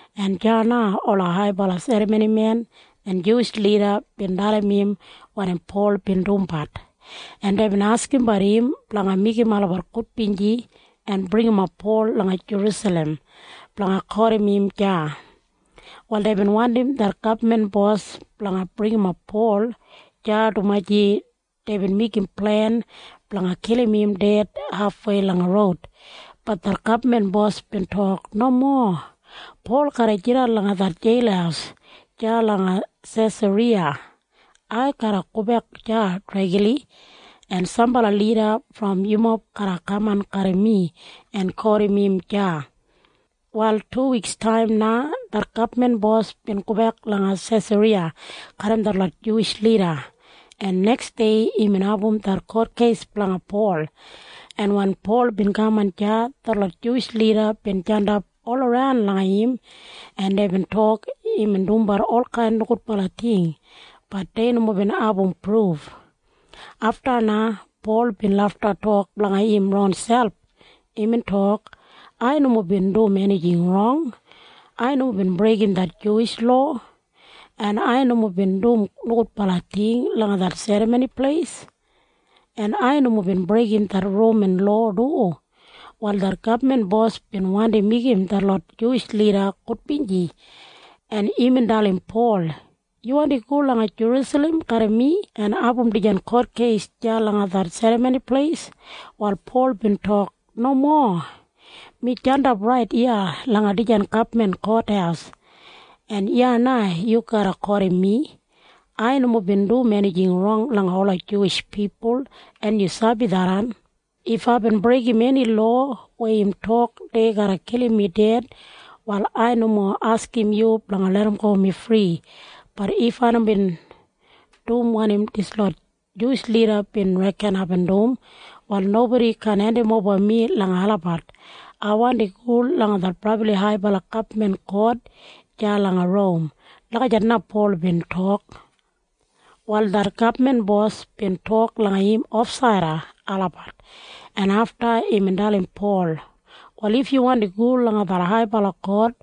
en deya na ola haibala serramonimen en Juwish lida bin dalim im wanim Pol bin dumbat, en deibin askimbat im blanga meigim olabat gudbinji en bringimap Pol langa Jerusalem blanga kotim im deya. Wal deibin wandim det gabman bos blanga bringimap Pol deya dumaji deibin meigim plen blanga kilim im ded hafwei langa roud. Bat det gabman bos bin tok, “Nomo. Pol garra jidan langa det jeil deya langa Sesariya. Ai garra gobek deya dregli, en sambala lida brom yumob garra kaman garram mi en kotim im deya.” Wal tuwikstaim na det gabman bos bin gobek langa Sesariya garram detlot Juwish lida, en neksdei imbin abum det kotkeis blanga Pol, en wen Pol bin kaman deya, detlot Juwish lida bin jandap olaran langa im, en deibin tok imbin dumbat olkain nogudbala ting. Bat dei nomo bin abum pruf. Afta na Pol bin lafta tok blanga im ronselp. Imbin tok, “Ai nomo bin dum enijing rong. Ai nomo bin breigim det Juwish lowa, en ai nomo bin dum nogudbala ting langa det Serramoni Pleis, en ai nomo bin breigim det Roman lowa du.” Wal det gabman bos bin wandi meigim detlot Juwish lida gudbinji, en imbin dalim Pol, “Yu wandi go langa Jerusalem garram mi en abum dijan kotkeis deya langa det Serramoni Pleis?” Wal Pol bin tok, “Nomo. Mi jandap rait iya langa dijan gabman kothaus, en iya na yu garra kotim mi. Ai nomo bin dum enijing rong langa ola Juwish pipul, en yu sabi tharran. If aibin breigim eni lowa weya im tok dei garra kilim mi ded, wal ai nomo askim yu blanga larramgo mi fri. Bat if ai nomo bin dum wanim dislot Juwish lida bin reken aibin dum, wal nobodi kaan hendimoba mi langa olabat. Ai wandi go langa det brabli haibala gabman kot deya langa Rom.” Lagijat na Pol bin tok. Wal det gabman bos bin tok langa im ofsaida olabat, en afta imbin dalim Pol, “Wal if yu wandi go langa det haibala kot,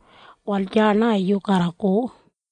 wal deya na yu garra go.”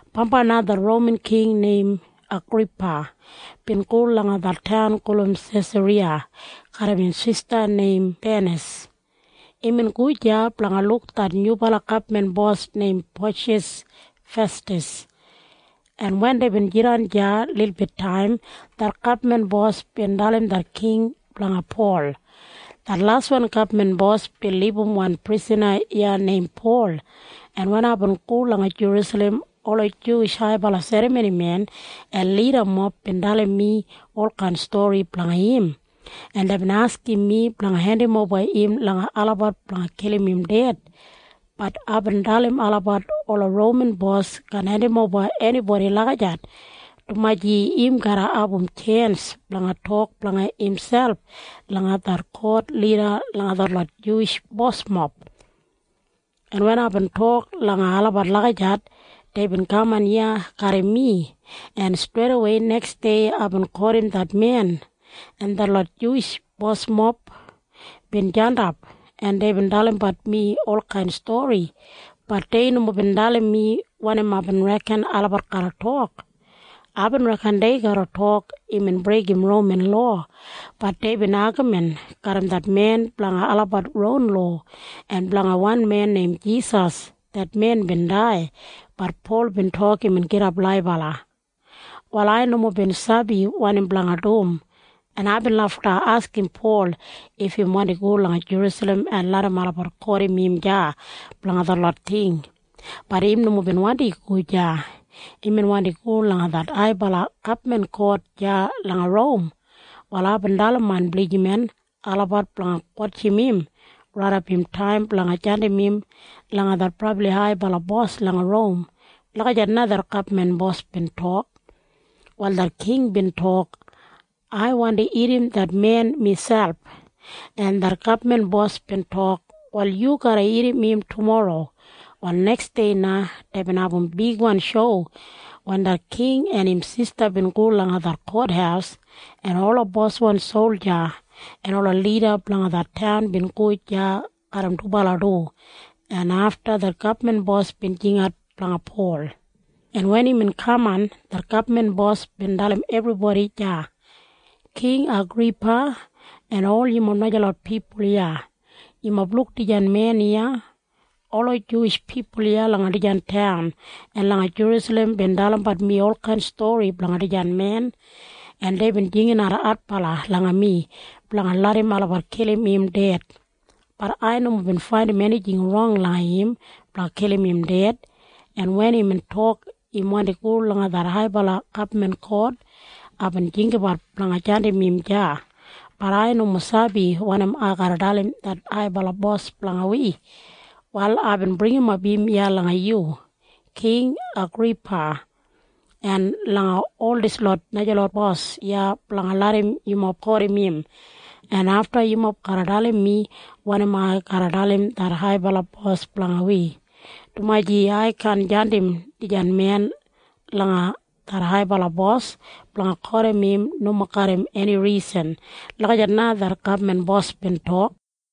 Bambai na det Roman king neim Agripa bin go langa det taun gulum Sesariya garram im sista neim Benis. Imbin go deya blanga luk det nyubala gabman bos neim Poshas Festas, en wen deibin jidan deya lilbit taim, det gabman bos bin dalim det king blanga Pol. “Det laswan gabman bos bin libum wan prisana iya neim Pol, en wen aibin go langa Jerusalem, ola Juwish haibala serramonimen en lidamob bin dalim mi olkain stori blanga im, en deibin askim mi blanga hendimoba im langa olabat blanga kilim im ded. Bat aibin dalim olabat ola Roman bos kaan hendimoba enibodi lagijat, dumaji im garra abum tjens blanga tok blanga imselp langa det kot lida langa detlot Juwish bosmob. En wen aibin tok langa olabat lagijat, deibin kaman iya garram mi, en streidawei neksdei aibin kotim det men, en detlot Juwish bosmob bin jandap, en deibin dalimbat mi olkain stori. Bat dei nomo bin dalim mi wanim aibin reken olabat garra tok. Aibin reken dei garra tok imbin breigim Roman lowa. Bat deibin agamin garram det men blanga olabat ron lowa en blanga wan men neim Jisas. Det men bin dai. Bat Pol bin tok imbin gidap laibala. “Wal ai nomo bin sabi wanim blanga dum, en aibin lafta askim Pol if im wandi go langa Jerusalem en larram olabat kotim im deya blanga detlot ting. Bat im nomo bin wandi go deya. Imbin wandi go langa det haibala gabman kot deya langa Rom. Wal aibin dalim main blijiman olabat blanga wotjim im raidap im taim blanga jandim im langa det brabli haibala bos langa Rom.” Lagijat na det gabman bos bin tok. Wal det king bin tok, “Ai wandi irrim det men miselp.” En det gabman bos bin tok, “Wal yu garra irrim im tumorro.” Wal neksdei na deibin abum bigwan shou wen det king en im sista bin go langa det kothaus, en ola boswan solja en ola lida blanga det taun bin go deya garram dubala du, en afta det gabman bos bin jingat blanga Pol, en wen imbin kaman, det gabman bos bin dalim ebribodi deya. “King Agripa en ol yumob najalot pipul iya, yumob luk dijan men iya? Ola Juwish pipul iya langa dijan taun en langa Jerusalem bin dalimbat mi olkain stori blanga dijan men, en deibin jinginat adbala langa mi blanga larram olabat kilim im ded. Bat ai nomo bin faindim enijing rong langa im blanga kilim im ded, en wen imbin tok im wandi go langa det haibala gabman kot, aibin jinggabat blanga jandim im deya. Bat ai nomo sabi wanim ai garra dalim det haibala bos blanga wi. “Wal aibin bringimap im iya langa yu, King Agripa, en langa ol dislot najalot bos iya blanga larram yumob kotim im, en afta yumob garra dalim mi wanim ai garra dalim det haibala bos blanga wi, dumaji ai kaan jandim dijan men langa det haibala bos blanga kotim im nomo garram eni risan.” Lagijat na det gabman bos bin tok.